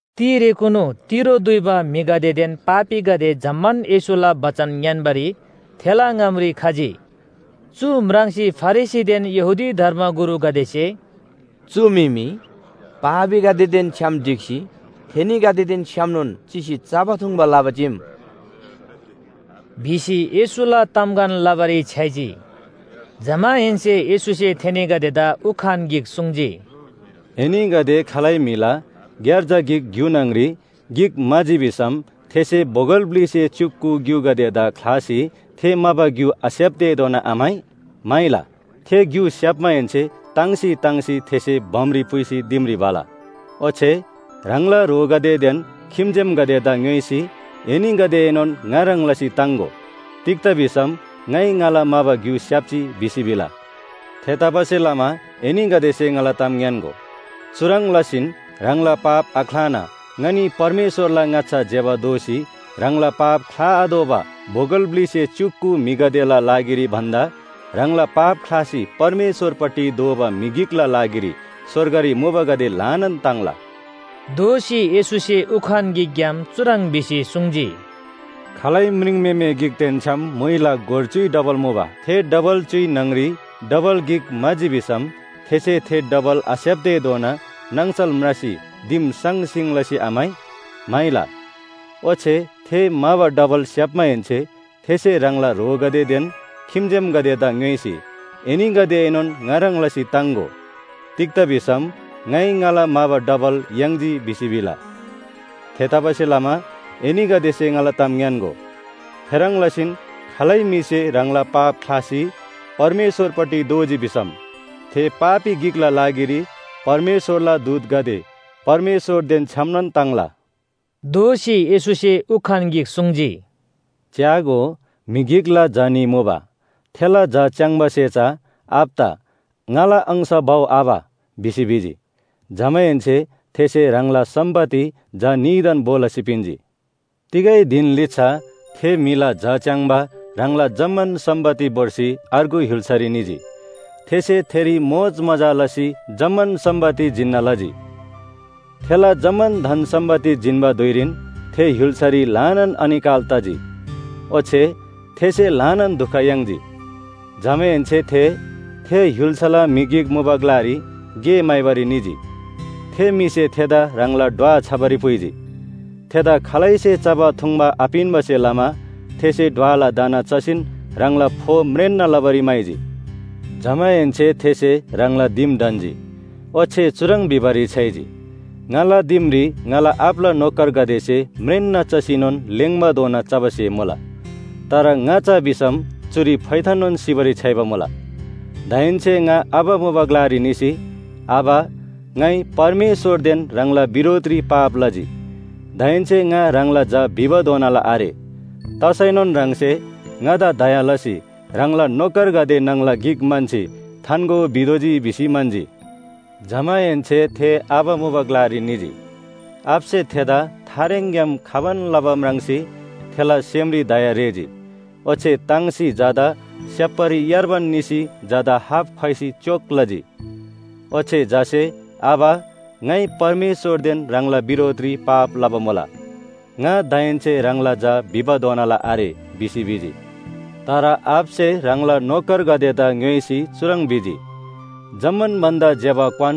तिरेकुनु तिरो दुइबा म्‍हिगदेदेन पापीगदे जम्‍मान येशूला बचन ङ्‌यान्‍बारी थेला ङामरी खजी। चु म्राङ्सी फरिसीदेन यहूदी धर्मगुरुगदेसे “चु म्‍हि मी पापीगदेदेन छ्‌याम ढिक्‍सी थेनीगदेदेन छ्‌यामनोन चिसी चबा थुङ्बा लबा चीम” भिसी येशूला तामगन लबारी छ्‌याइजी। जमाहेन्‍से येशूसे थेनीगदेदा उखान गिक सुङ्जी, “एनीगदे खालै म्‍हिला ग्‍यार्जा गिक ग्‍यु न्‍हङरी गिक म्‍हाजी भिसम थेसे बोगल ब्‍लिसे च्‍युक कु ग्‍युगदेदा ख्‍लासी थे म्‍हाबा ग्‍यु आस्‍याप्‍तेधोना आम्‍हाइ? म्‍हाइला। थे ग्‍यु स्‍याप्‍माहेन्‍से ताङ्सी ताङ्सी थेसे बमरी पुइसी दिमरी भला। ओच्‍छे ह्राङला ह्रोगदेदेन खिम्‍जेमगदेदा ङ्‌योइसी एनीगदेएनोन ङा ह्रङ् लसी ताङ्‍गो। तिग्‍दा भिसम ‘ङाइ ङाला म्‍हाबा ग्‍यु स्‍याप्‍जी’ भिसी भिला। थेतबासेलमा एनीगदेसे ङाला ताम ङ्‌यान्‍गो, चुह्रङ् लसीन ह्राङला पाप आख्‍लाना ङनी परमेश्‍वरला ङाच्‍छा ज्‍यबा दोसी ह्राङला पाप ख्‍लाआतोःबा बोगल ब्‍लिसे च्‍युक कु म्‍हिगदेला लागिरी भन्‍दा ह्राङला पाप ख्‍लासी परमेश्‍वरपट्टि दोःबा म्‍हि गिकला लागिरी स्‍वर्गरी मुबागदे ल्‍हानान ताङ्ला। दोःसी येशूसे उखान गिकग्‍याम चुह्रङ् भिसी सुङ्जी, “खालै म्रिङम्‍हेमे गिकदेन छ्‌याम म्‍हुइला गोर च्‍युइ डबल मुबा। थे डबल च्‍युइ न्‍हङरी डबल गिक म्‍हाजी भिसम थेसे थे डबल आस्‍याप्‍तेधोना नाङसल म्रासी दिम साङसिङ लसी आम्‍हाइ? म्‍हाइला। ओच्‍छे थे म्‍हाबा डबल स्‍याप्‍माहेन्‍से थेसे ह्राङला ह्रोगदेदेन खिम्‍जेमगदेदा ङ्‌योइसी ‘एनीगदेएनोन ङा ह्रङ् लसी ताङ्‍गो। तिग्‍दा भिसम ङाइ ङाला म्‍हाबा डबल याङ्जी’ भिसी भिला। थेतबासेलमा एनीगदेसे ङाला ताम ङ्‌यान्‍गो, थेह्रङ् लसीन खालै म्‍हिसे ह्राङला पाप ख्‍लासी परमेश्‍वरपट्टि दोःजी भिसम थे पापी गिकला लागिरी परमेश्‍वरला दूतगदे परमेश्‍वरदेन छ्‌यामनोन ताङ्ला।” दोःसी येशूसे उखान गिक सुङ्जी, “च्‍यागो, म्‍हि गिकला झा न्‍ही मुबा। थेला झा च्‍याङ्‍बासे चा आबादा ‘ङाला अंश भउ आबा’ भिसी भिजी। जमाहेन्‍से थेसे ह्राङला सम्‍पत्ति झा न्‍हीदान भो लसी पिन्‍जी। “तिगै धिन लिच्‍छा थे म्‍हिला झा च्‍याङ्बा ह्राङला जम्‍मान सम्‍पत्ति भोर्सी अर्गु य्‍हुल्‍सारी निजी। थेसे थेरी मोजमजा लसी जम्‍मान सम्‍पत्ति जिन्‍ना लजी। थेला जम्‍मान धन सम्‍पत्ति जिन्‍बा धुइरीन थे य्‍हुल्‍सारी ल्‍हानान अनिकाल तजी, ओच्‍छे थेसे ल्‍हानान दुख याङ्जी। जमाहेन्‍से थे, थे य्‍हुल्‍साला म्‍हि गिक मुबा ग्‍लारी गे म्‍हाइबारी निजी। थे म्‍हिसे थेदा ह्राङला ढ्वा छबारी पुइजी। थेदा खालैसे चबा थुङ्बा आपिन्‍बासे लमा थेसे ढ्वला दाना चसीन ह्राङला फो म्रेन्‍ना लबारी म्‍हाइजी। “जमाहेन्‍से थेसे ह्राङला दिम ढन्‍जी। ओच्‍छे चुह्रङ् भिबारी छ्‌याइजी, ‘ङाला दिमरी ङाला आबाला नोकरगदेसे म्रेन्‍ना चसीनोन लेङ्बाधोना चबा स्‍हे मुला। तर ङा चा भिसम चुरी फोइथाननोन सिबारी छ्‌याइबा मुला। दाहेन्‍से ङा आबा मुबा ग्‍लारी निसी, “आबा, ङाइ परमेश्‍वरदेन ह्राङला बिरोधरी पाप लजी। दाहेन्‍से ङा ह्राङला झा भिबाधोनाला आरे। तसैनोन ह्राङसे ङादा दया लसी ह्राङला नोकरगदे न्‍हङला गिक म्‍हन्‍सी थान्‍गो भितोःजी”’ भिसी म्‍हन्‍जी। “जमाहेन्‍से थे आबा मुबा ग्‍लारी निजी। आबासे थेदा थारेङग्‍याम खबान लबा म्राङ्सी थेला सेमरी दया रेःजी। ओच्‍छे ताङ्सी झादा स्‍याप्‍बारी यार्बान निसी झादा हाप ख्‍वाइसी च्‍योक लजी। ओच्‍छे झासे ‘आबा, ङाइ परमेश्‍वरदेन ह्राङला बिरोधरी पाप लबा मुला। ङा दाहेन्‍से ह्राङला झा भिबाधोनाला आरे’ भिसी भिजी। तर आबासे ह्राङला नोकरगदेदा ङ्‌योइसी चुह्रङ् भिजी, ‘जम्‍मान भन्‍दा ज्‍यबा क्‍वान,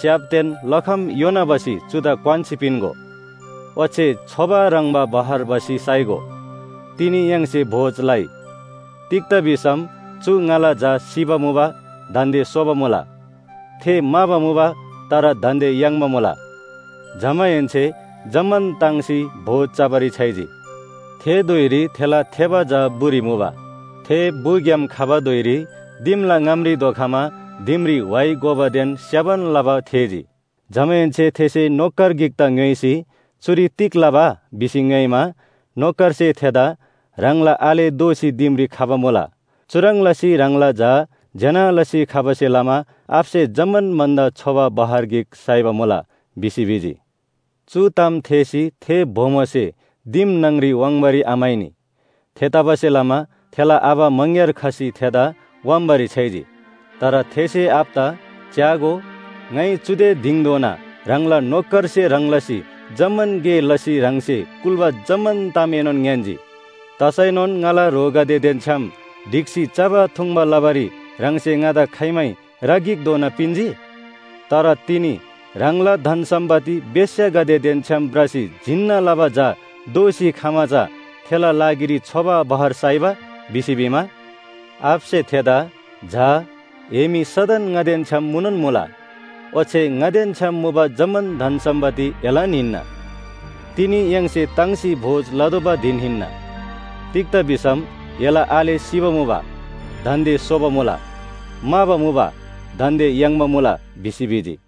च्‍याप‍देन लखम योना भसी चुदा क्‍वान्‍सी पिन्‍गो। ओच्‍छे छोबा ह्रङ्‌बा बहर भसी साइगो। तिनी य्‍हाङसे भोज लइ। तिग्‍दा भिसम चु ङाला झा सिबा मुबा दान्‍दे सोबा मुला, थे म्‍हाबा मुबा तर दान्‍दे याङ्बा मुला।’ जमाहेन्‍से जम्‍मान ताङ्सी भोज चबारी छ्‌याइजी। “थे धुइरी थेला थेबा झा बुरी मुबा। थे बुग्‍याम खबा धुइरी दिमला ङामरी धोखमा दिमरी व्‍हाइ गोबादेन स्य्‍हबान लबा थेःजी। जमाहेन्‍से थेसे नोकर गिकदा ङ्‌योइसी, ‘चुरी तिग लबा?’ भिसी ङ्‌योइमा, नोकरसे थेदा ‘ह्राङला आले दोःसी दिमरी खबा मुला। चुह्रङ् लसी ह्राङला झा ज्‍यना लसी खबासे लमा आबासे जम्‍मान भन्‍दा छोबा बहर गिक साइबा मुला’ भिसी भिजी। “चु ताम थेःसी थे बोमोसे दिम न्‍हङरी वाङ्बारी आम्‍हाइनी। थेतबासेलमा थेला आबा मङग्‍यार खसी थेदा व्‍हाम्‍बारी छ्‌याइजी। तर थेसे आबादा ‘च्‍यागो, ङाइ चुदे दिङधोना ह्राङला नोकरसे ह्रङ् लसी जम्‍मान गे लसी ह्राङसे कुल्‍बा जम्‍मान तामएनोन ङ्‌यान्‍जी। तसैनोन ङाला ह्रोगदेदेन छ्‌याम ढिक्‍सी चबा थुङ्बा लबारी ह्राङसे ङादा खाइमै रा गिकधोना पिन्‍जी? तर तिनी ह्राङला धन सम्‍पत्ति बेश्‍यागदेदेन छ्‌याम भ्रसी जिन्‍ना लबा झा दोःसी खमा चा थेला लागिरी छोबा बहर साइबा?’ भिसी भिमा, आबासे थेदा ‘झा, ए मी सदन ङादेन छ्‌याम मुनोन मुला। ओच्‍छे ङादेन छ्‌याम मुबा जम्‍मान धन सम्‍पत्ति एलान हिन्‍ना। तिनी य्‍हाङसे ताङ्सी भोज लतोःबा धिन हिन्‍ना। तिग्‍दा भिसम एला आले सिबा मुबा दान्‍दे सोबा मुला, म्‍हाबा मुबा दान्‍दे याङ्बा मुला’ भिसी भिजी।”